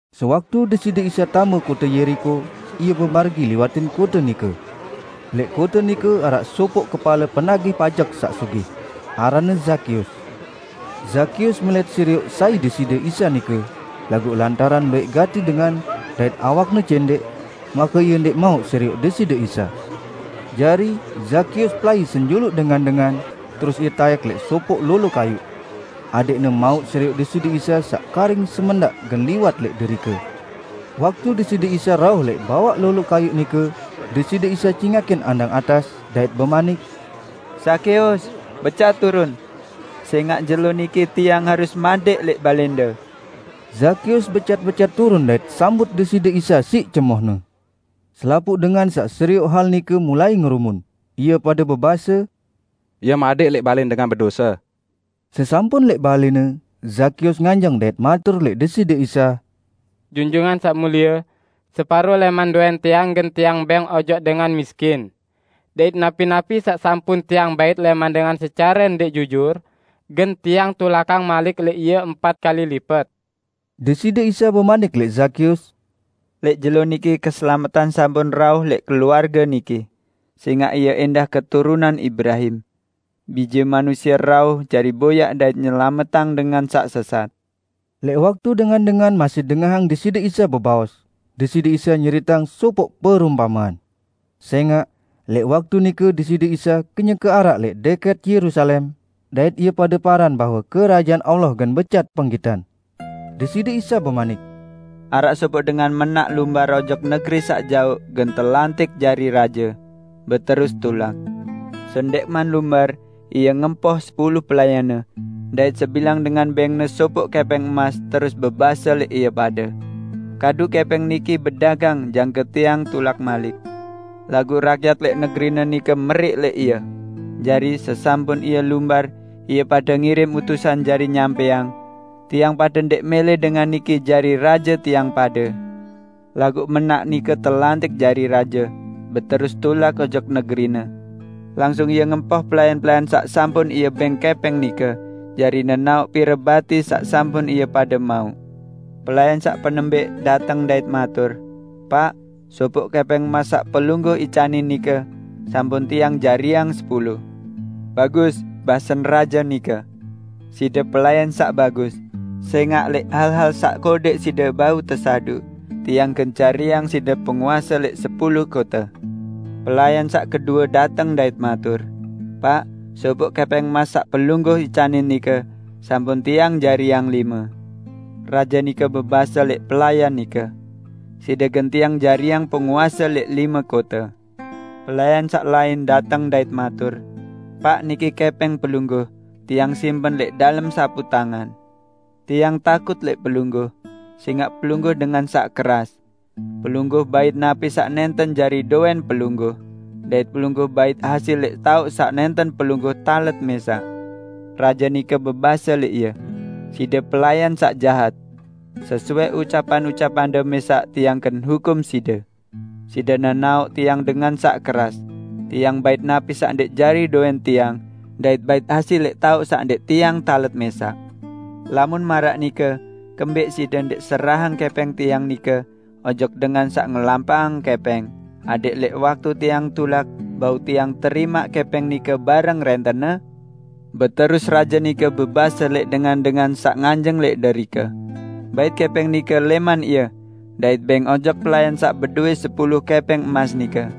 Sewaktu Deside Isa tame kote Yeriko, Ie bemargi liwatin kote nike. Lẽq kote nike araq sopoq kepale penagih pajek saq sugih. Aranne Zakeus. Zakeus melẽt serioq sai Deside Isa nike, laguq lantaran luwẽq gati dengan dait awakne cẽndẽq, make ie ndẽq mauq serioq Deside Isa. Jari, Zakeus pelai senjuluq dengan-dengan, terus ie taẽk lẽq sopoq lolo kayuq, adẽqne mauq serioq Deside Isa saq karing semendaq gen liwat lẽq derike. Waktu Deside Isa rauh lẽq bawaq lolo kayuq nike, Deside Isa cingakin andang atas dait bemanik, "Zakeus, becat turun! Sẽngaq jelo niki Tiang harus madẽq lẽq balẽnde." Zakeus becat-becat turun dait sambut Deside Isa siq cemohne. Selapuq dengan saq serioq hal nike mulai ngerumun, ie pade bebase, "Ie madẽq lẽq balẽn dengan bedose!" Sesampun lẽq balẽne, Zakeus nganjeng dait matur lẽq Deside Isa, "Junjungan Saq Mulie, separo lẽman dowẽn tiang gen tiang bẽng ojok dengan miskin; dait napi-napi saq sampun tiang bait lẽman dengan secare ndẽq jujur, gen tiang tulakang malik lẽq ie empat kali lipet!" Deside Isa bemanik lẽq Zakeus, "Lẽq jelo niki keselametan sampun rauh lẽq keluarge niki, sẽngaq ie ẽndah keturunan Ibrahim. Bije Manusie rauh jari boyaq dait nyelametang dengan saq sesat." Lẽq waktu dengan-dengan masih dengahang Deside Isa bebaos, Deside Isa nyeriteang sopoq perumpamean. Sẽngaq, lẽq waktu nike Deside Isa kenyeke araq lẽq dẽkẽt Yerusalem, dait ie pade paran bahwe Kerajaan Allah gen becat penggitan. Deside Isa bemanik, "Araq sopoq dengan mẽnak lumbar ojok negeri saq jaoq gen telantik jari raje, beterus tulak. Sendẽqman lumbar, ie ngempoh sepulu pelayanne, dait sebilang dengan bẽngne sopoq kẽpẽng emas terus bebase lẽq ie pade, 'Kadu kẽpẽng niki bedagang jangke tiang tulak malik.' Laguq rakyat lẽq negerine nike meriq lẽq ie. Jari, sesampun ie lumbar, ie pade ngirim utusan jari nyampẽang, 'Tiang pade ndẽq mẽlẽ dengan niki jari raje tiang pade.' Laguq mẽnak nike telantik jari raje, beterus tulak ojok negerine. Langsung ie ngempoh pelayan-pelayan saq sampun ie bẽng kẽpẽng nike jari nenaoq pire bati saq sampun ie pade mauq. Pelayan saq penembẽq dateng dait matur, 'Paq, sopoq kẽpẽng emas saq pelungguh icanin nike, sampun tiang jariang sepulu.' 'Bagus,' basen raje nike. 'Side pelayan saq bagus! Sẽngaq lẽq hal-hal saq kodẽq side bau tesaduq, tiang gen jariang side penguase lẽq sepulu kote.' Pelayan saq kedue dateng dait matur, 'Paq, sopoq kẽpẽng emas saq pelungguh icanin nike, sampun tiang jariang lime.' Raje nike bebase lẽq pelayan nike, 'Side gen tiang jariang penguase lẽq lime kote.' Pelayan saq lain dateng dait matur, 'Paq, niki kẽpẽng pelungguh; tiang simpen lẽq dalem saputangan. Tiang takut lẽq pelungguh, sẽngaq pelungguh dengan saq keras. Pelungguh bait napi saq nẽnten jari dowẽn pelungguh, dait pelungguh bait hasil lẽq taoq saq nẽnten pelungguh talet mẽsaq.' Raje nike bebase lẽq ie, 'Side pelayan saq jahat! Sesuai ucapan-ucapande mẽsaq tiang gen hukum side. Side nenaoq tiang dengan saq keras: Tiang bait napi saq ndẽq jari dowẽn tiang dait bait hasil lẽq taoq saq ndẽq tiang talet mẽsaq. Lamun maraq nike kembẽq side ndẽq serahang kẽpẽng tiang nike ojok dengan saq ngelampaqang kẽpẽng adẽq lẽq waktu tiang tulak bau tiang terimaq kẽpẽng nike bareng rẽntenne?' Beterus raje nike bebase lẽq dengan-dengan saq nganjeng lẽq derike, 'Bait kẽpẽng nike lẽman ie dait bẽng ojok pelayan saq bedowẽ sepulu kẽpẽng emas nike.'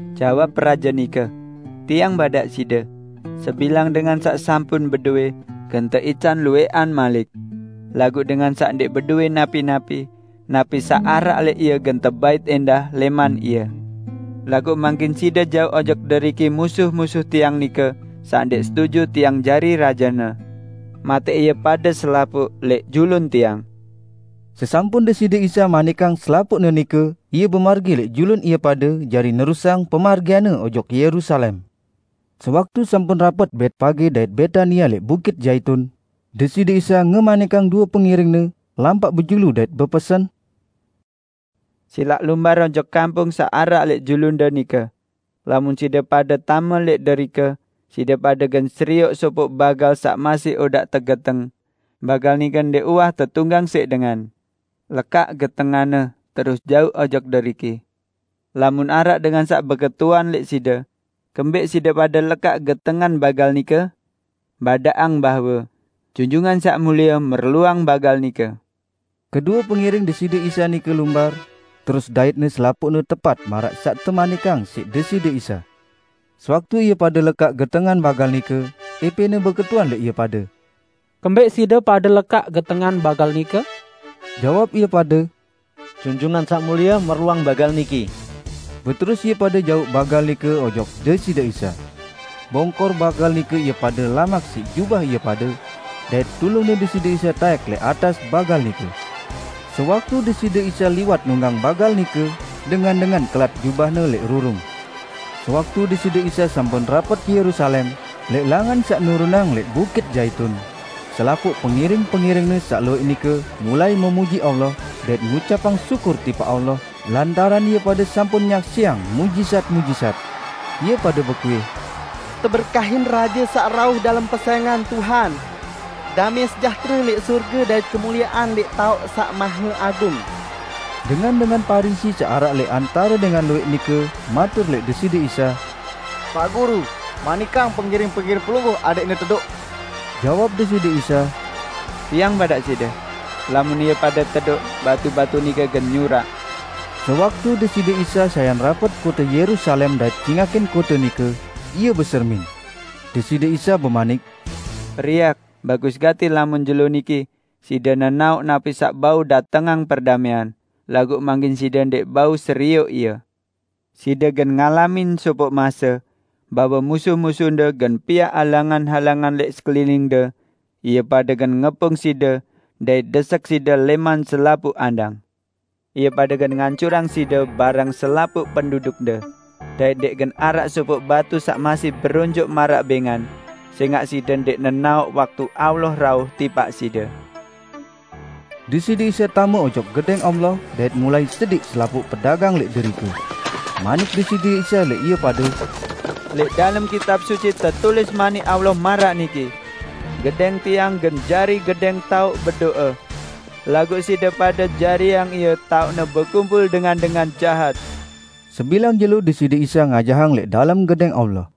Jawab raje nike, 'Tiang badaq side: sebilang dengan saq sampun bedowẽ, gen teican luwẽqan malik. Laguq dengan saq ndẽq bedowẽ napi-napi, napi saq araq lẽq ie gen tebait ẽndah lẽman ie. Laguq mangkin side jauq ojok deriki musuh-musuh tiang nike saq ndẽq setuju tiang jari rajene. Matẽq ie pade selapuq lẽq julun tiang!' " Sesampun Deside Isa manikang selapuqne nike Ie bemargi lẽq julun ie pade jari nerusang ojok Yerusalem. Sewaktu sampun rapet pemargian-Ne Betpage dait Betania lẽq Bukit Zaitun, Deside Isa ngemanikang due pengiring-Ne lampaq bejulu dait bepesen, "Silaq lumbar ojok kampung saq araq lẽq julunde nike: Lamun side pade tame lẽq derike, side pade gen serioq sopoq bagal saq masih odaq tegeteng. Bagal nike ndẽq uwah tetunggang siq dengan. Lekaq getenganne terus jauq ojok deriki. Lamun araq dengan saq beketuan lẽq side, 'Kembẽq side pade lekaq getengan bagal nike?' Badaqang bahwe, 'Junjungan Saq Mulie merluang bagal nike.' " Kedue pengiring Deside Isa nike lumbar, terus daitne selapuqne tepat maraq saq temanikang siq Deside Isa. Sewaktu ie pade lekaq getengan bagal nike, ẽpẽne beketuan lẽq ie pade, "Kembẽq side pade lekaq getengan bagal nike?" Jawab ie pade, "Junjungan Saq Mulie merluang bagal niki." Beterus ie pade jauq bagal nike ojok Deside Isa. Bongkor bagal nike ie pade lamak siq jubah ie pade, dait tulungne Deside Isa taẽk lẽq atas bagal nike. Sewaktu Deside Isa liwat nunggang bagal nike, dengan-dengan kelat jubahne lẽq rurung. Sewaktu Deside Isa sampun rapet Yerusalem, lẽq langan saq nurunang lẽq Bukit Zaitun, selapuq pengiring-pengiring-Ne saq luwẽq nike mulai memuji Allah dait ngucapang syukur tipaq Allah lantaran ie pade sampun nyaksiang muqjizat-muqjizat. Ie pade bekuih, "Teberkahin Raje saq rauh dalem pesẽngan Tuhan! Damẽ sejahtere lẽq sorge dait kemuliean lẽq taoq saq maheagung!" Dengan-dengan Parisi saq araq lẽq antare dengan luwẽq nike matur lẽq Deside Isa, "Paq Guru, manikang pengiring-pengiring Pelungguh adẽqne tedoq." Jawab Deside Isa, "Tiang badaq side! Lamun ie pade tedoq, batu-batu nike gen nyurak." Sewaktu Deside Isa sayan rapet kote Yerusalem dait cingakin kote nike, Ie besermin. Deside Isa bemanik, "Periak, bagus gati lamun jelo niki side nenaoq napi saq bau datengang perdamẽan; laguq mangkin side ndẽq bau serioq ie. Side gen ngalamin sopoq mase, bahwe musuh-musuhde gen piaq halangan-halangan lẽq sekeliningde, ie pade gen ngepung side dait desek side lẽman selapuq andang. Ie pade gen ngancurang side bareng selapuq pendudukde; dait ndẽq gen araq sopoq batu saq masih beronjoq maraq bẽngan, sẽngaq side ndẽq nenaoq waktu Allah rauh tipaq side!" Deside Isa tame ojok Gedẽng Allah dait mulai sediq selapuq pedagang lẽq derike. Manik Deside Isa lẽq ie pade, "Lẽq dalem Kitab Suci tetulis Manik Allah maraq niki: 'Gedẽng Tiang gen jari gedẽng taoq bedo'e.' Laguq side pade jariang ie taoqne bekumpul dengan-dengan jahat!" Sebilang jelo Deside Isa ngajahang lẽq dalem Gedẽng Allah.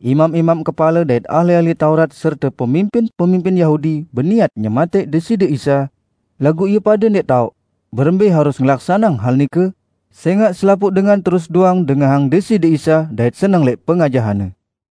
Imam-imam kepale dait ahli-ahli Taurat serte pemimpin-pemimpin Yahudi beniat nyematẽq Deside Isa, laguq ie pade ndẽq taoq, berembẽ harus ngelaksaneang hal nike, sẽngaq selapuq dengan terus doang dengahang Deside Isa dait seneng lẽq pengajahan-Ne.